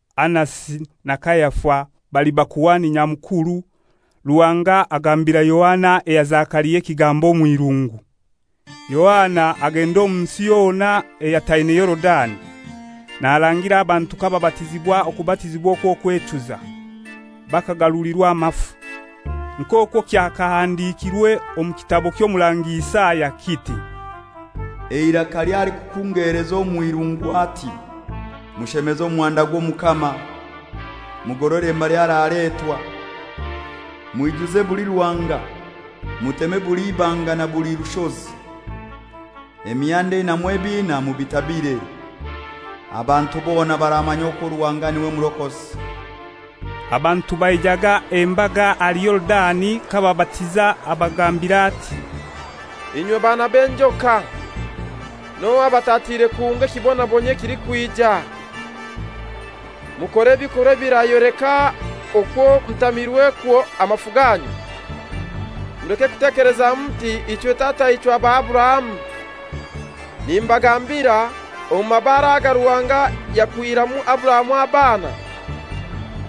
Anasi na Kayafa bali Bakuhani Nyamukuru, Ruhanga agambira Yohana eya Zekaria ekigambo omw'irungu. Yohana agenda omu nsi yona eyataine Yorudani, narangira abantu kababatizibwa okubatizibwa okw'okwechuza, bakagarulirwa amafu. Nk'okwo kyakahandikirwe omu kitabo ky'Omurangi Isaya, kiti, «Eiraka ly'alikukungeleza omw'irungu ati: Mushemeze omuhanda gw'Omukama, mugorore mbali araletwa. Mwijuze buli ruhanga, muteme buli ibanga na buli rushozi, emihanda einamu ebiina mubitabire; abantu bona baramanya okwo Ruhanga n'iwe Murokozi.» Abantu baijaga embaga ahali Yorudani k'ababatiza, abagambira ati, «Inywe baana b'enjoka! N'ohai abatatiire kuhunga ekibonabonyio ekilikwija? Mukore ebikorwa ebirayoleka okwo mutamirwekwo amafu ganyu. Muleke kutekeleza muti, ‹Ichwe tataichwe aba Aburahamu;› nimbagambira, omu mabaare aga Ruhanga yakwihiramu Aburahamu abaana.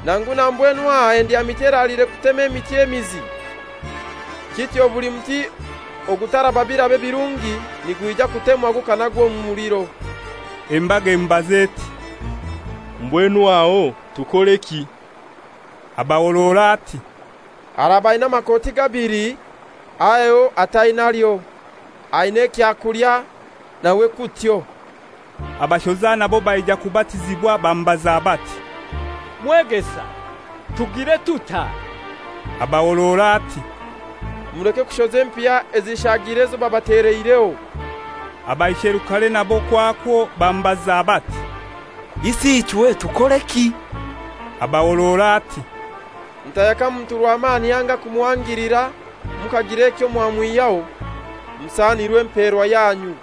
Nangu na mbwenu aha endyamiti eraliire kutema emiti emizi. Kityo buli muti ogutaraba biraba birungi nigwija kutemwa gukanagwa omu muliro.» Embaga emubaza eti, «Mbwenu aho tukoreki?» Abahorora ati, «Araba aina amakoti gabili, aheho atainalyo. Aina ekyakulya, nawe kutyo.» Abashoza nabo baija kubatizibwa bamubaza bati, «Mwegesa, tugire tutai?» Abahorora ati, «Muleke kushoza empiha ezishaagire ezo babateleireho.» Abaisherukare nabo kwakwo bamubaza bati, «Isi ichwe tukoreki?» Abahorora ati, «Mutayaka muntu rwamani anga kumuhangilira mukagira ekyo mwamwihyaho. Musanirwe emperwa yanyu.»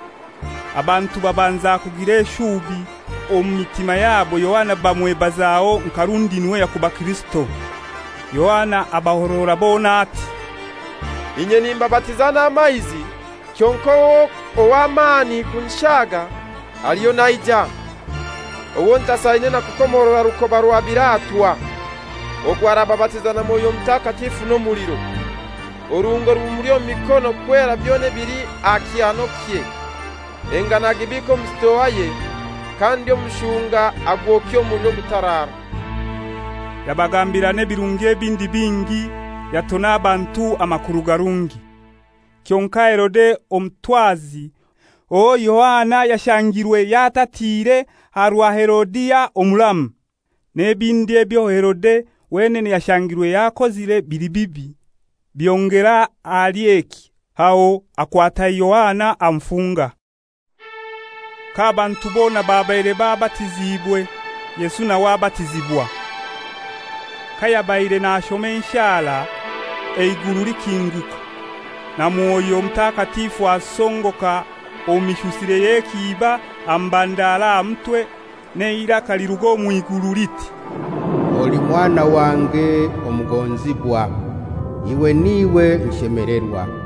Abantu babanza kugira eshubi, omu mitima yabo Yohana bamwebazaho nka rundi n'iwe yakuba Kirisito. Bona Yohana abahorora ati, «Inye nimbabatiza n'amaizi; kyonkai ow'amani kunshaaga aliyo naija, owo ntasaine na kukomorora rukoba rwa biratwa. Ogwo arababatiza na Mwoyo Mutakatifu n'omuliro. Oruhungo rumuli omu mikono kwera byona ebili aha kyanokye, engano agibiike omu sitoaye, kandi omushunga agwokye omu muliro ogutaraara.» Yabagambira n'ebirungi ebindi bingi, yatona abantu amakuru garungi. Kyonkai Herode omutwazi, owo Yohana yashangirwe yatatiire aha rwa Herodia, omuramu, n'ebindi ebyo Herode wenene yashangirwe yakozire bili bibi, byongera ahali eki, aho akwata Yohana amufunga. K'abantu bona babaire babatiziibwe, Yesu nawe abatizibwa. Kayabaire nashoma enshara, eiguru likinguka, na Mwoyo Mutakatifu asongoka omu mishusire y'ekiiba amubandara aha mutwe, n'eiraka liruga omw'iguru liti, «Oli Mwana wange omugonzibwa, iwe n'iwe nshemelerwa.»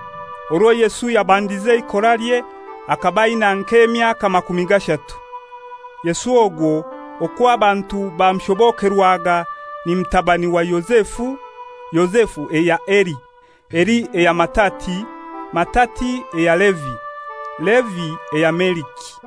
Orwo Yesu yabandize eikoralye, akaba aina nk'emyaka makumi gashatu. Yesu ogwo (okwo abantu bamushobokerwaga) ni mutabani wa Yozefu, Yozefu eya Heli. Heli eya Matatia, Matatia eya Levi, Levi eya Meliki.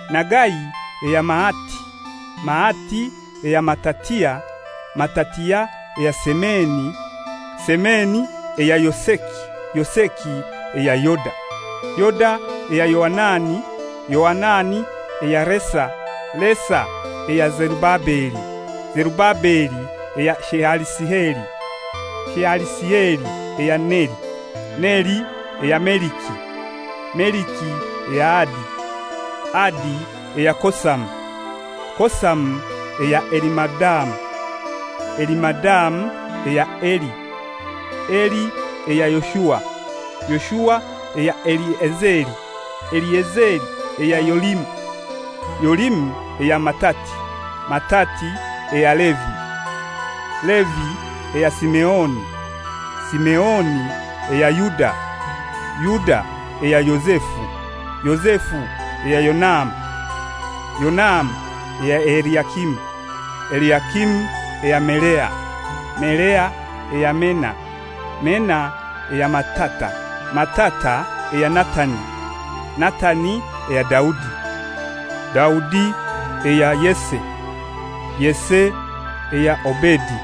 Nagai eya Maati, Maati eya Matatia, Matatia eya Semeni, Semeni eya Yoseki, Yoseki eya Yoda. Yoda eya Yoanani, Yoanani eya Resa, Resa eya Zerubabeli, Zerubabeli eya Shealisieli, Shealisieli eya Neri. Neri eya Meliki, Meliki eya Adi, Adi eya Kosamu, Kosamu eya Elimadamu, Elimadamu eya Eri. Eri eya Yoshua, Yoshua eya Eliezeri, Eliezeri eya Yorimu, Yorimu eya Matati, Matati eya Levi. Levi eya Simeoni, Simeoni eya Yuda, Yuda eya Yozefu, Yozefu eya Yonamu, Yonamu eya Eliakimu. Eliakimu eya Melea, Melea eya Mena, Mena eya Matata, Matata eya Natani, Natani eya Daudi. Daudi eya Yese, Yese eya Obedi,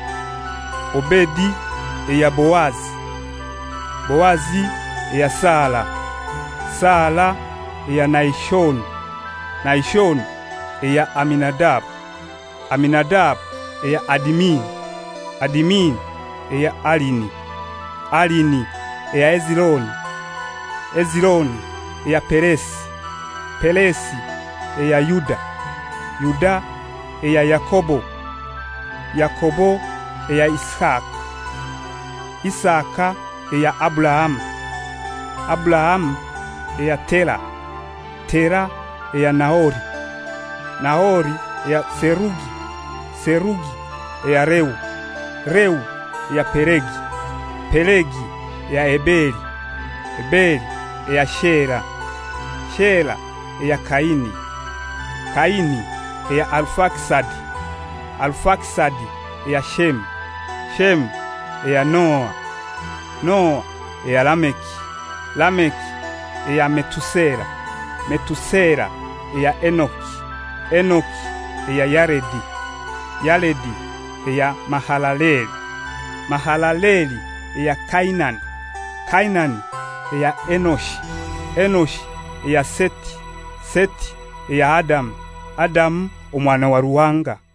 Obedi eya Boazi, Boazi eya Sala, Sala eya Nahishoni. Nahishoni eya Aminadabu, Aminadabu eya Adimini, Adimini eya Arini, Arini eya Hezironi, Hezironi eya Peresi, Peresi eya Yuda. Yuda eya Yakobo, Yakobo eya Isaka, Isaka eya Aburahamu, Aburahamu eya Tera, Tera eya Nahori. Nahori eya Serugi, Serugi eya Reu, Reu eya Pelegi, Pelegi eya Eberi, Eberi eya Shela. Shela eya Kaini, Kaini eya Arufakisadi, Arufakisadi eya Shemu, Shemu eya Noa, Noa eya Lameki. Lameki eya Metusela, Metusela eya Enoki, Enoki eya Yaredi, Yaredi eya Mahalaleli, Mahalaleli eya Kainani. Kainani eya Enoshi, Enoshi eya Seti, Seti eya Adamu, Adamu omwana wa Ruhanga.